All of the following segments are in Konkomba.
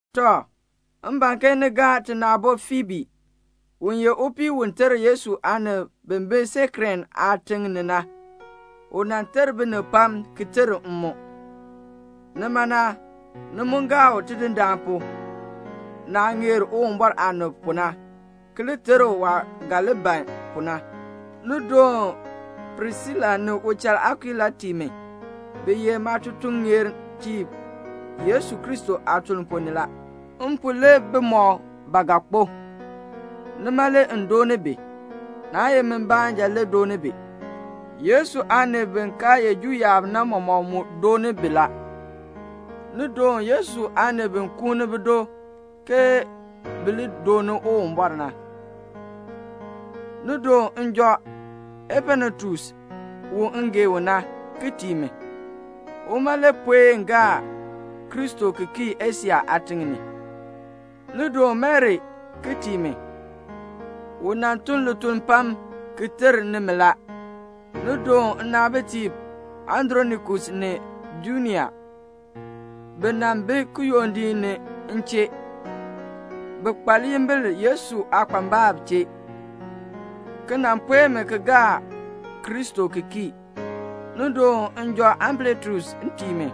Tɔ, m ban ke ni gaa tina aabo Fiibi. U ye upii u ter Yesu aanib bi bi Seŋkrea aatiŋ ni na. U nan ter binib pam ki ter m mu. Nima na, ni mu gaa u Tidindaan pu, naah ŋeer Uwumbɔr aanib pu na, ki li ter u waah ga li ban pu na. Ni doon Prisila ni uchal Akuila tii mi. Bi ye maatutuŋeertiib Yesu Kristo aatuln ponn ni la. M pu le bimɔk ba ga kpo. Nima le m dooni bi. Naa ye mi baanja le dooni bi. Yesu aanib bi kaa ye Juu yaab na mɔmɔk mu dooni bi la. Ni doon Yesu aanib bi kuuni bido ke bi li dooni Uwumbɔr na. Ni doon njɔ Epanetus, u m gee u na, ki tii mi. Uma le puen gaa Kristo ki kii Asia aatiŋ ni. Ni doon Mari ki tii mi. U nan tun lituln pam ki ter nimi la. Ni doon nnaabitiib Andronikus ni Junia. Bi nan bi kiyondiik ni m chee. Bi kpa liyimbil Yesu aakpambalb chee, ki nan puen mi ki gaa Kristo ki kii. Ni doon njɔ Ampliatus tii mi.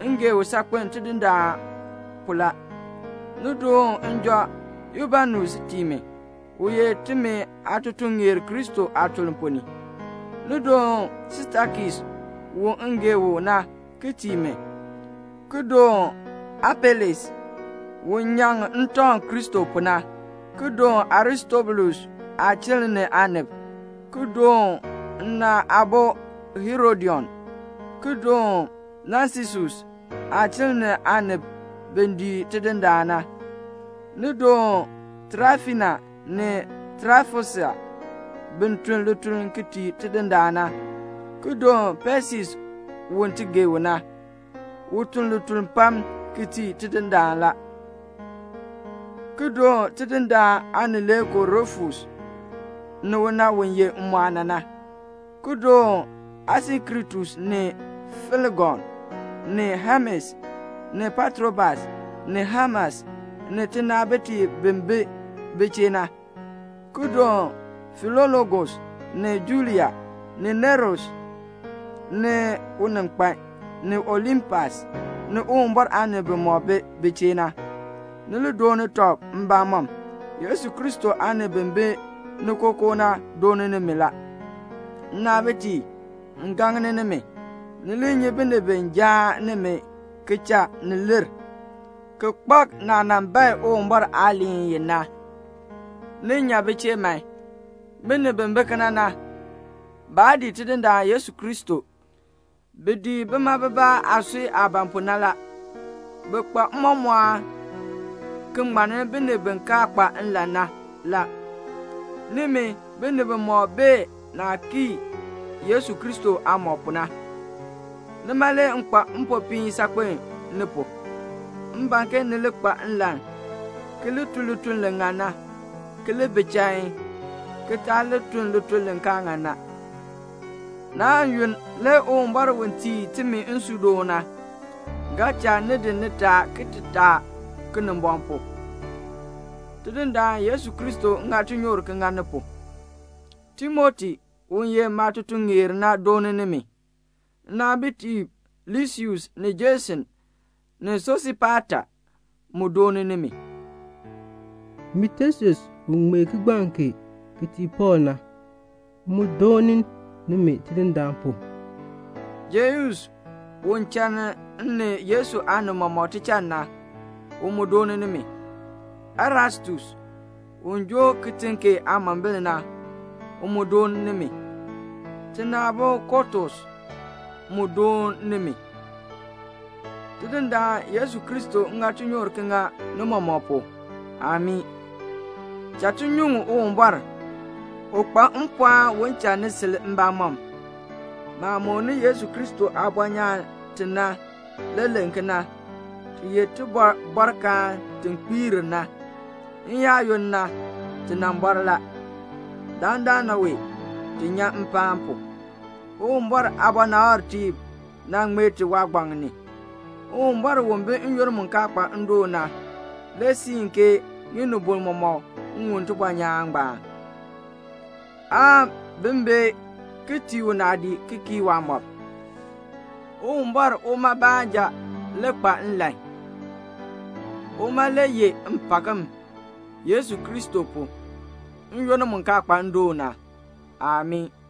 M gee u saakpen Tidindaan pu la. Ni doon njɔ Ubanus tii mi, u ye timi aatutuŋeer Kristo aatuln ponn ni. Ni doon Stakis u m gee u na ki tii mi, ki doon Apeles, u nyaŋ ntɔŋ Kristo pu na, ki doon Aristobulus aachiln ni aanib, ki doon nna aabo Herodion, ki doon Nasisus aachiln ni aanib bi dii Tidindaan na. Ni doon Traifina ni Traifosa bi tun lituln tii Tidindaan na, ki doon Pesis u ti gee u na, u tun lituln pam ki tii Tidindaan la, ki doon Tidindaan aanileekoo Rufus, ni una u ye m mu aana na, ki doon Asinkritus ni Flegon, ni Hemes, ni Patrobas, ni Hemas, ni tinaabitiib bin bi bi chee na, ki doon Filologus, ni Julia, ni Nereus ni uninkpan, ni Olimpas, ni Uwumbɔr aanib bimɔk bi bi chee na. Ni li dooni tɔb mbamɔm. Yesu Kristo aanib bi bi ni kookoo na dooni nimi la. Nnaabitiib, m gaŋni nimi, ni li nyi binib bi jaan nimi ki cha ni lir, ki kpak naah nan bae Uwumbɔr aaliin i na. Ni nya bi chee man. Binib bi bi kena na, baa dii Tidindaan Yesu Kristo. Bi dii bima bibaa aasui aah ban pu na la. Bi kpa mmɔmɔɔn ki ŋmanni binib bi kaa kpa nlan na la. Nimi, binib mɔmɔk bee naah kii Yesu Kristo aamɔb pu na. Nima le m kpa mpopiin saakpen ni pu. M ban ke ni li kpa nlan ki li tun lituln li ŋan na, ki li bi chain, ki taa li tun lituln li kaa ŋan na. Naan yunn, le Uwumbɔr u tii timi nsuudoon na, ga cha ni di nitaa ki taa Kinimbɔŋ pu. Tidindaan Yesu Kristo ŋa tinyoor ki ŋa ni pu. Timoti, u ye maatutuŋeer na doon nimi. Nnaabitiib Lusius ni Jason ni Sosipata mu doon nimi. Min Tesius u ŋmee kigbaŋ kee ki tii Pɔɔl na, m mu doon nimi Tidindaan pu. Geus u chann min Pɔɔl ni Yesu aanib mɔmɔk tichann na, u mu doon nimi. Erastus, u joo kitiŋ kee aamombil na, u mu doon nimi. Tina aabo Kɔɔtus mu doon nimi. Tidindaan Yesu Kristo ŋa tinyoor ki ŋa ni mɔmɔk pu. Amii.] Cha ti nyuŋ Uwumbɔr. U kpa mpɔɔn un cha ni sil mbamɔm. Maah mooni Yesu Kristo aabɔnyaan ti na le len kena. Ti ye tibɔbɔrkaan ti kpiir na. N-yaayoonn na ti nan bɔr la. Dandana wee, ti nyan mpaan pu. Uwumbɔr aabɔnabtiib nan ŋmee ti waagbaŋ ni. Uwumbɔr, u bi n-yoonn mu kaa kpa ndoon na le siin ke ŋinibol mɔmɔk ŋun tibɔnyaan ngbaan, aan bi bee ki tii u naadii ki kii waamɔb. Uwumbɔr, uma baanja le kpa nlan. Uma le yeh mpakm Yesu Kristo pu, n-yoonn mu kaa kpa ndoon na. Amii.